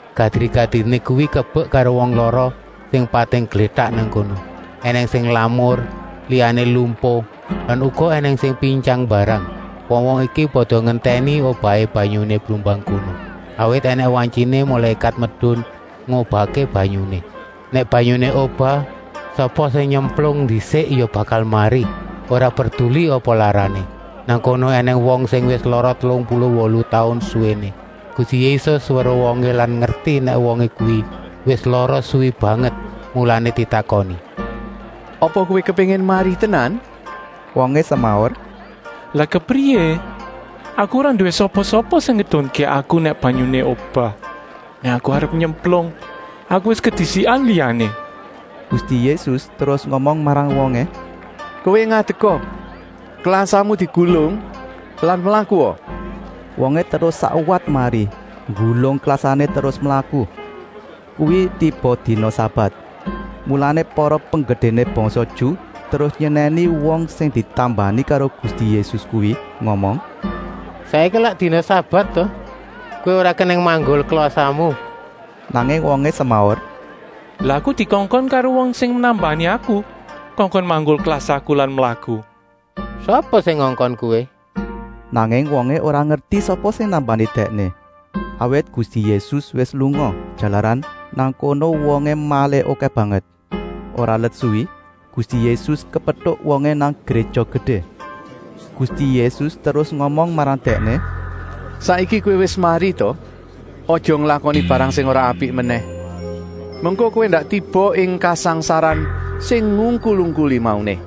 Gadri-gadriné kuwi kebek karo wong lara sing pating glétak nang kono. Enèng sing lamur, liyané lumpuh lan uga ènèng sing pintyang mbarang. Wong-wong iki pada ngentèni obahé banyuné blumbang kono. Awit ènèng wantyiné mulékat medun ngobahké banyuné. Nèk banyuné obah, sapa sing nyemplung ndisik ya bakal mari, ora perduli apa larané. Nang kono ènèng wong sing wis lara telung puluh wolu taun suwéné. Gusti Yésus weruh wongé lan ngerti nèk wong kuwi wis lara suwi banget, mulané ditakoni: “Apa kowé kepéngin mari tenan?” Wongé semaur: “Lah kepriyé, aku ora nduwé sapa-sapa sing ngedunké aku nèk banyuné obah! Nèk aku arep nyemplung, aku wis kedisikan liyané.” Gusti Yésus terus ngomong marang wongé: “Kowé ngadeka! Klasamu digulung lan mlakua!” Wongé terus sakwat mari, nggulung klasané terus mlaku. Kuwi tiba dina sabat. Mulané para penggedéné bangsa Ju terus nyenèni wong sing ditambani karo Gusti Yésus kuwi, ngomong: “Saiki lak dina sabat ta? Kowé ora kenèng manggul klasamu.” Nanging wongé semaur: “Lah aku dikongkon karo wong sing nambani aku kongkon manggul klasaku lan mlaku!” “Sapa sing ngongkon kowé?” Nanging wongé ora ngerti sapa sing nambani dèkné, awit Gusti Yésus wis lunga, jalaran nang kono wongé malih okèh banget. Ora let suwi Gusti Yésus kepetuk wongé nang Gréja Gedé. Gusti Yésus terus ngomong marang dèkné: “Saiki kowé wis mari ta! Aja nglakoni barang sing ora apik menèh, mengko kowé ndak tiba ing kasangsaran sing ngungkul-ungkuli mauné.”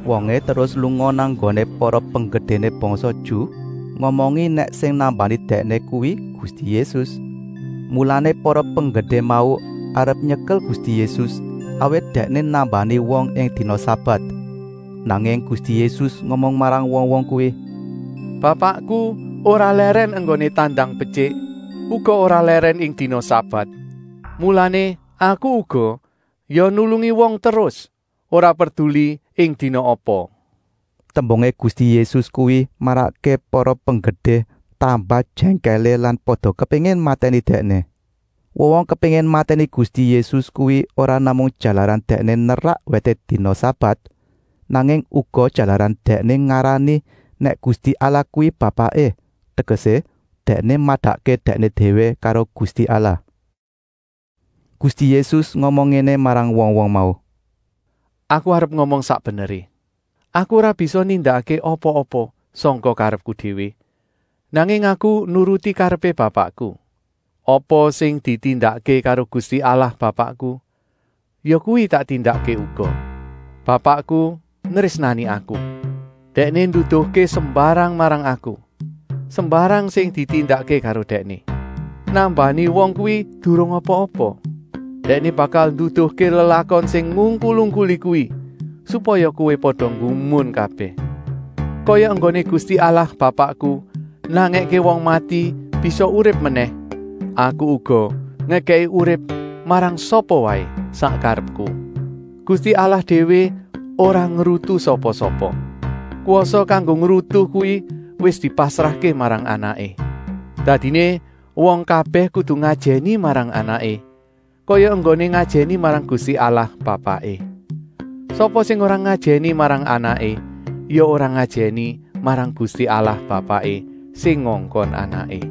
Wongé terus lunga nang nggoné para penggedéné bangsa Ju, ngomongi nèk sing nambani dèkné kuwi Gusti Yésus. Mulané para penggedé mau arep nyekel Gusti Yésus, awit Dèkné nambani wong ing dina sabat. Nanging Gusti Yésus ngomong marang wong-wong kuwi: “Bapakku ora lèrèn enggoné tandang betyik, uga ora lèrèn ing dina sabat, mulané Aku uga ya nulungi wong terus, ora perduli ing dina apa.” Tembungé Gusti Yésus kuwi marakké para penggedé tambah jèngkèlé lan pada kepéngin matèni Dèkné. Wong-wong kepéngin matèni Gusti Yésus kuwi ora namung jalaran Dèkné nerak wèté dina sabat, nanging uga jalaran Dèkné ngarani nèk Gusti Allah kuwi Bapaké, tegesé Dèkné madakké Dèkné déwé karo Gusti Allah. Gusti Yésus ngomong ngéné marang wong-wong mau: “Aku arep ngomong sak beneré. Aku ora bisa nindakké apa-apa sangka karepku déwé, nanging Aku nuruti karepé Bapakku. Apa sing ditindakké karo Gusti Allah Bapakku, yakuwi tak tindakké uga. Bapakku nrésnani Aku. Dèkné nduduhké sembarang marang Aku, sembarang sing ditindakké karo Dèkné. Nambani wong kuwi durung apa-apa. Dèkné bakal nduduhké lelakon sing ngungkul-ungkuli kuwi, supaya kowé pada nggumun kabèh! Kaya enggoné Gusti Allah Bapakku nangèké wong mati bisa urip menèh, Aku uga ngekèki urip marang sapa waé sak karepku. Gusti Allah déwé ora ngrutu sapa-sapa. Kwasa kanggo ngrutu kuwi wis dipasrahké marang Anaké. Dadiné wong kabèh kudu ngajèni marang Anaké, kaya enggoné ngajèni marang Gusti Allah Bapaké. Sapa sing ora ngajèni marang Anaké ya ora ngajèni marang Gusti Allah Bapaké sing ngongkon Anaké.”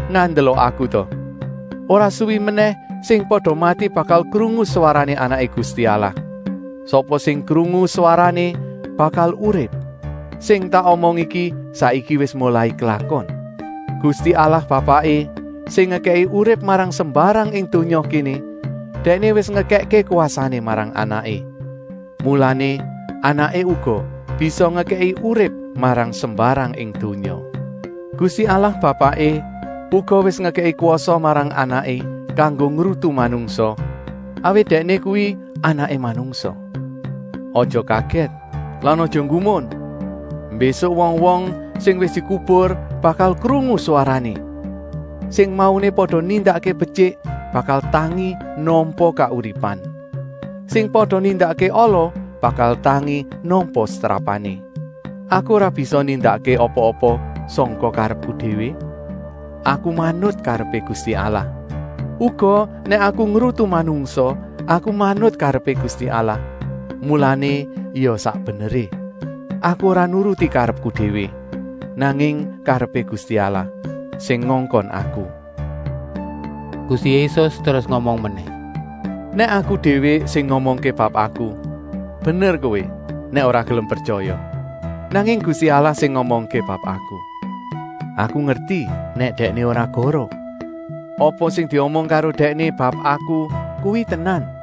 Ngandela Aku ta! Ora suwi menèh sing pada mati bakal krungu swarané Anaké Gusti Allah. Sapa sing krungu swarané bakal urip. Sing tak omong iki saiki wis molai klakon. Gusti Allah Bapaké, sing ngekèki urip marang sembarang ing donya kéné, Dèkné wis ngekèkké kwasané marang Anaké, mulané Anaké uga bisa ngekèki urip marang sembarang ing donya. Gusti Allah Bapaké uga wis ngekèki kwasa marang Anaké kanggo ngrutu manungsa, awit Dèkné kuwi Anaké Manungsa. Aja kagèt lan aja nggumun! Mbésuk wong-wong sing wis dikubur bakal krungu swarané. Sing mauné pada nindakké betyik bakal tangi nampa kauripan. Sing pada nindakké ala bakal tangi nampa setrapané. Aku ora bisa nindakké apa-apa sangka karepku déwé. Aku manut karepé Gusti Allah. Uga nèk Aku ngrutu manungsa, Aku manut karepé Gusti Allah, mulané ya sak beneré. Aku ora nuruti karepku déwé, nanging karepé Gusti Allah, sing ngongkon Aku.” Gusti Yésus terus ngomong menèh: “Nèk Aku déwé sing ngomongké bab Aku, bener kowé nèk ora gelem pretyaya. Nanging Gusti Allah sing ngomongké bab Aku. Aku ngerti nèk Dèkné ora goroh. Apa sing diomong karo Dèkné bab Aku kuwi tenan.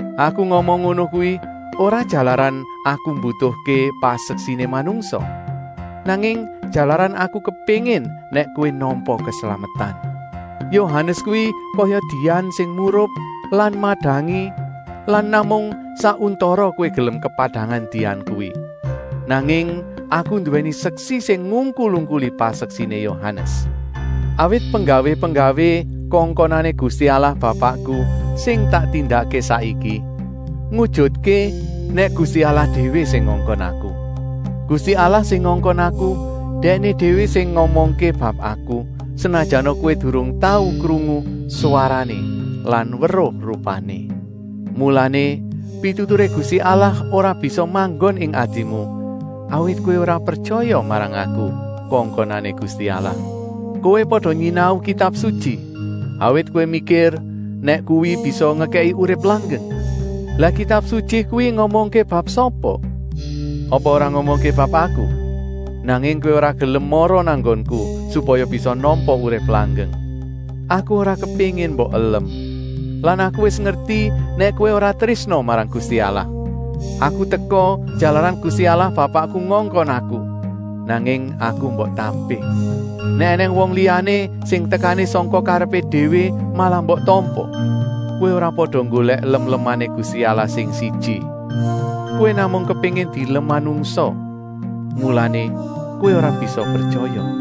Aku ngomong ngono kuwi ora jalaran Aku mbutuhké paseksiné manungsa, nanging jalaran Aku kepéngin nèk kowé nampa keslametan. Yohanes kuwi kaya dian sing murup lan madangi lan namung sak untara kowé gelem kepadangan dian kuwi. Nanging Aku nduwèni seksi sing ngungkul-ungkuli paseksiné Yohanes. Awit penggawé-penggawé kongkonané Gusti Allah Bapakku sing tak tindakké saiki ngujutké nèk Gusti Allah déwé sing ngongkon Aku. Gusti Allah sing ngongkon Aku, Dèkné déwé wis ngomongké bab Aku, senajana kowé durung tau krungu swarané lan weruh rupané. Mulané pituturé Gusti Allah ora bisa manggon ing atimu, awit kowé ora pretyaya marang Aku, kongkonané Gusti Allah. Kowé pada nyinau Kitab Sutyi, awit kowé mikir nèk kuwi bisa ngekèki urip langgeng. Lah Kitab Sutyi kuwi ngomongké bab sapa? Apa ora ngomongké bab Aku? Nanging kowé ora gelem mara nang nggonku supaya bisa nampa urip langgeng. “Aku ora kepéngin mbok elem. Lan Aku wis ngerti nèk kowé ora trésna marang Gusti Allah. Aku teka jalaran Gusti Allah Bapakku ngongkon Aku, nanging Aku mbok tampik. Nèk ènèng wong liyané sing tekané sangka karepé déwé malah mbok tampa. Kowé ora pada nggolèk lem-lemané Gusti Allah sing siji. Kowé namung kepéngin dielem manungsa, mulané kowé ora bisa pretyaya.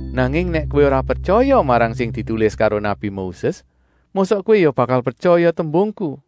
Nanging nèk kowé ora pretyaya marang sing ditulis karo nabi Moses, mosok kowé ya bakal pretyaya tembungku?”